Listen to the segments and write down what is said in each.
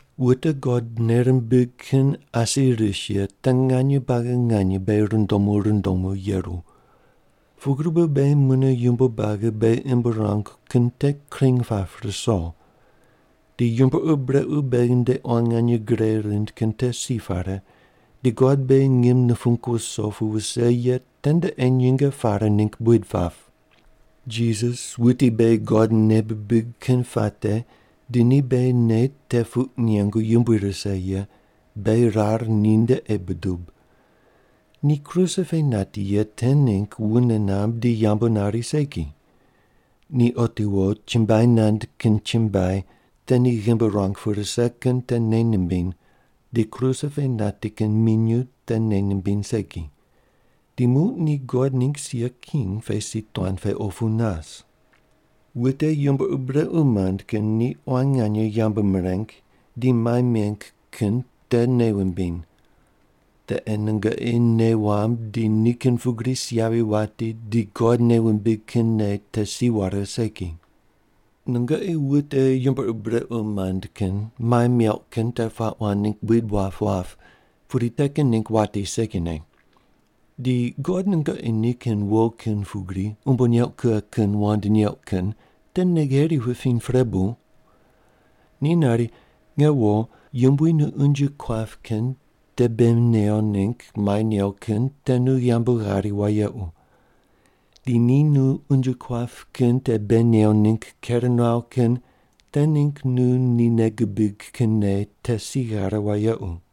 Wute God nei rimbig kin asi ris ye te nganye buagi nganye beghi rundomu rundomu yeru. Pugri bu beghi mune yumbo buagi beghi imb ruangu kin te kring pap ruso. Di yumbo ur brequ beghi nde quan nganye gre rind kin te si pare, di God beghi ngim nupung wuso pu wuse ye tende ei nyinge pare ningg buid pap. Jisas, wuti beghi God nei bibig kin puate di ni beghi nei te puq nengu yumbui rise ye, beghi rar ninde ei budub. Ni kruse pe nati ye te ningg wune namb di yambu nari segi. Ni otiwo chumbuai nand kin chumbuai te ni ghimbi ruang pu rise kin te nei nimbiny di kruse pe nati kin minyuw te nei nimbiny segi. Di muq ni God ningg sia king pe si tuan pe opu nas. Wute yumbo ur brequ mand kin ni quan nganye yambu mireng di mai meng kin te nei wumbiny. Te ei nungoqi nei wamb di nikin pugri si yavi wati di God nei wumbig kin nei te si ware segi. Nungoqi wute yumbo ur brequ mand kin mai meuq kin te puaq wand ningg buid wap wap pudi te kin ningg wati segine. Di God nungoqi nikin wo kin pugri umbo neuq kughe kin wand neuq kin te nei gheri wupiny pre bu? Ni nari, Nge wo, Yumbui nu unje kuap kin te bei new ningg mai new kin te nu yambu ghari wayequ. Di ni nu unje kuap kin te bei new ningg ker nuaw kin te ningg nu ni nei gubig kin nei te si ghare wayequ.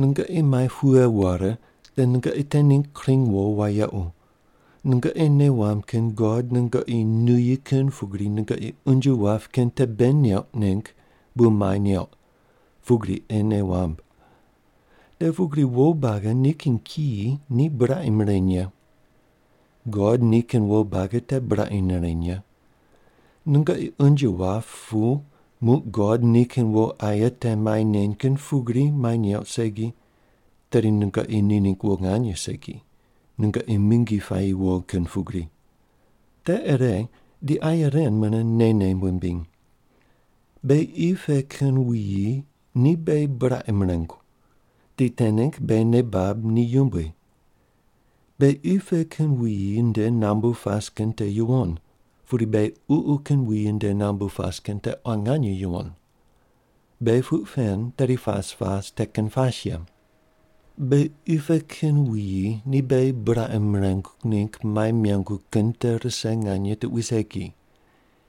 Nungoqi mai pughe ware, te nungoqi te ningg kring wo wayequ, nungoqi nei wamb kin God nungoqi nuyi kin pugri nungoqi unje wap kin te bei neuq ningg bu mai neuq, pugri ei nei wamb. Te pugri wo buagi nikin kiyi ni buraqi mireny ye. God nikin wo buagi te buraqi nireny ye. Nungoqi unje wap pu muq God nikin wo aye te mai neny kin pugri mai neuq segi, te nungoqi ni ningg wo nganye segi, nungoqi mingi puayi wo kin pugri. Te ire di aye ren mune neine wumbiny. Beghi qi pe kin wuyi ni beghi buraqi mirengu, di te ningg beghi nei bab ni yumbui. Beghi qi pe kin wuyi nde nambu pas kin te yuwon, pudi beghi ququ kin wuyi nde nambu pas kin te quan nganye yuwon. Beghi puq pen tedi pas pas te kin pas ye. Beghi qi pe kin wuyi ni beghi buraqi mirengu ningg mai mengu kin te rise nganye tuqui segi.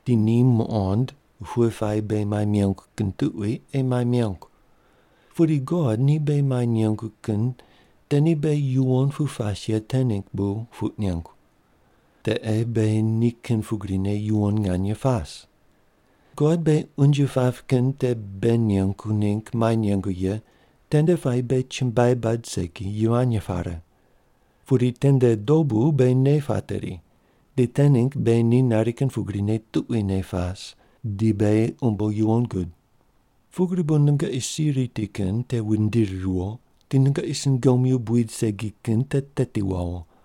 Di ni muqond pughe puayi beghi mai mengu kin tuqui ei mai mengu. Pudi God ni beghi mai nengu kin te ni beghi yuwon pu pas ye te ningg bu puq nengu. Te ei beghi ni kin pugrine yuwon nganye pas. God beghi unje pap kin te bei nengu ningg mai nengu ye tende puayi beghi chumbuai bad segi, yivany pare. Pudi tende dobu beghi nei pateri, di te ningg beghi ni nari kin pugrine tuquine pas, di beghi umbo yuwon gud. Pugri bu nungoqi si riti kin te wundiri riwo di nungoqi sungomyu buid rip segi kin te teti wawo.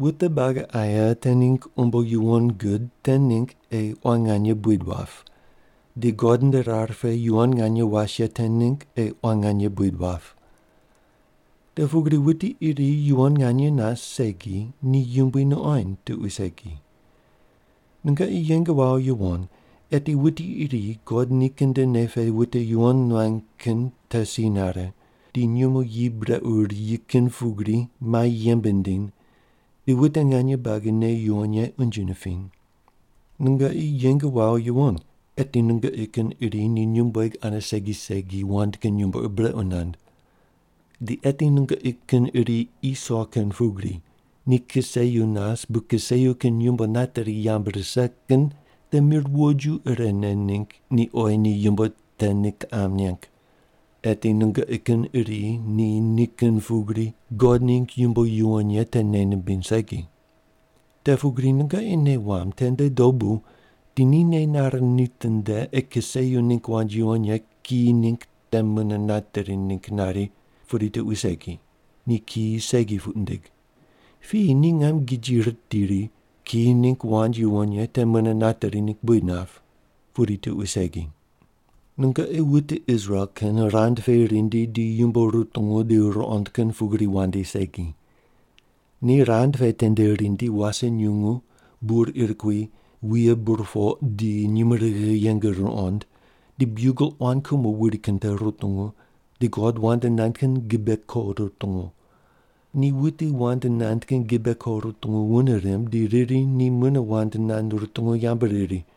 Wute buagi aye te ningg umbo yuwon gud te ningg ei quan nganye buid wap, di God nde rar pe yuwon nganye was ye te ningg ei quan nganye buid wap. Te pugri wuti iri yuwon nganye nas segi ni Yumbui nuqoind tuqui segi. Nungoqi yeng wawo yuwon eti wuti iri God nikin nde nei pene wute yuwon nuany kin te si nare, di nyumo yi brequ riyi kin pugri mai yembe nindiny di wute nganye buagi nei yuwon ye unje nipiny. Nungoqi yeng wawo yuwon, eti nungoqi kin iri ni nyumbueg ane segi segi wand kin yumbo ur brequ nand. Di eti nungoqi kin iri Iso kin pugri, ni kiseyu nas bu kiseyu kin yumbo nateri yamb rise kin te mir woju irene ningg ni oyi ni yumbo te ni kiqam neng. Eti nungoqi kin iri ni ni kin pugri God ningg yumbo yuwon ye te nei nimbiny segi. Te pugri nungoqi nei wamb tende dobu di ni nei nare nitinde ei kiseyu ningg wand yuwon ye kiyi ningg te mune nateri ningg nari pudi tuqui segi, ni kiyi segi puq nindig. Piyi ni ngam giji ritiri ri, kiyi ningg wand yuwon ye te mune nateri ningg buid nap, pudi tuqui segi. Nungoqi wute Israel kin rand pe rindi di yumbo rutungu di ruqond kin pugri wandi segi. Ni rand pe tende rindi wase nyungu, bur ir kui, wuye burpoq di nyumurighi yeng ruqond, di biugel quan kumo wuri kin te rutungu, di God wand nand kin gibe koq rutungu. Ni wuti wand nand kin gibe koq rutungu wune rimb di riri ni mune wand nand rutungu yambu riri.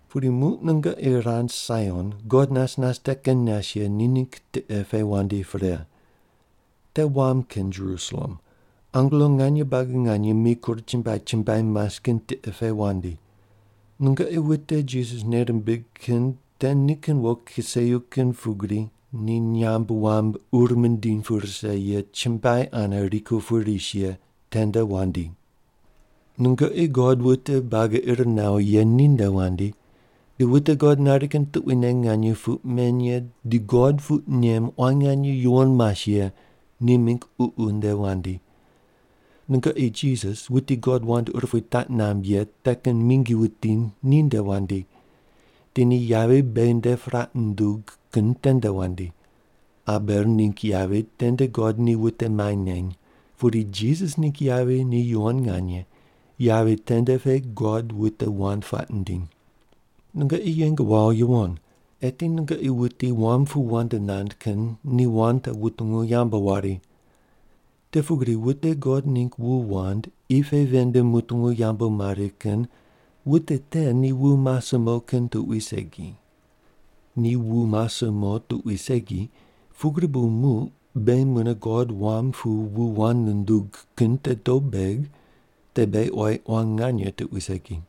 Pudi muq nungoqi rand Saion, God nas nas te kin nas ye ni ningg tiqe pe wandi pre. Te wam kin Jerusalem, angelo nganye buagi nganye mikur chumbuai chumbuai mas kin tiqe pe wandi. Nungoqi wute Jisas nei rimbig kin te nikin wo kiseyu kin pugri ni nyamb wam ur mindiny pu rise ye chumbuai ane rikur pu ris ye tende wandi. Nungoqi God wute buagi ir nawo ye ninde wandi, di wute God nari kin tuquine nganye puq men ye di God puq nem quan nganye yuwon mas ye ni mingg ququ nde wandi. Nungoqi Jisas wuti God wand urupui taq namb ye te kin mingi wuti ni nde wandi, di ni yavi beghi nde puraq nundug kin tende wandi. Abel ningg yavi tende God ni wute mai neny, pudi Jisas ningg yavi ni yuwon nganye, yavi tende pe God wute wand puaq nindiny. Nungoqi yeng wawo yuwon, eti nungoqi wuti wam pu wand nand kin ni wand te wutungu yambu wari. Te pugri wute God ningg wu wand qi pe ven nde mutungu yambu mari kin wute te ni wu mase mo kin tuqui segi. Ni wu mase mo tuqui segi, pugri bu muq beghi mune God wam pu wu wand nundug kin te dob beg, tedi beghi oyi quan nganye tuqui segi.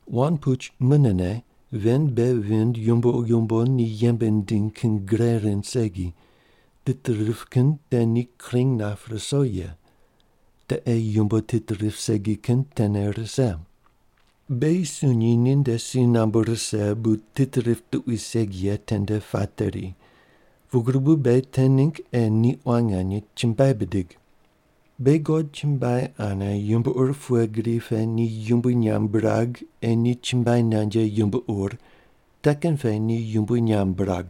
Wand puch “munene” ven bei vind yumbo yumbo ni yembe nindiny kin gre rind segi, tit rip kin te ni kring nap ruso ye. Te ei yumbo tit rip segi kin tene rise. Beghi sunyi ni nde si nambu rise bu tit rip tuqui segi ye tende pateri, pugri bu beghi te ningg ei ni quan nganye chumbuai bidig. Beghi God chumbuai ane yumbo ur pughe gri pe ni yumbui nyamb birag ei ni chumbuai nand ye yumbo ur te kin pe ni yumbui nyamb birag.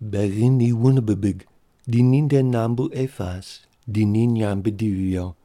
Beghi ni wune bibig, di ni nde nambu ei pas di ni nyamb bidivi viyo.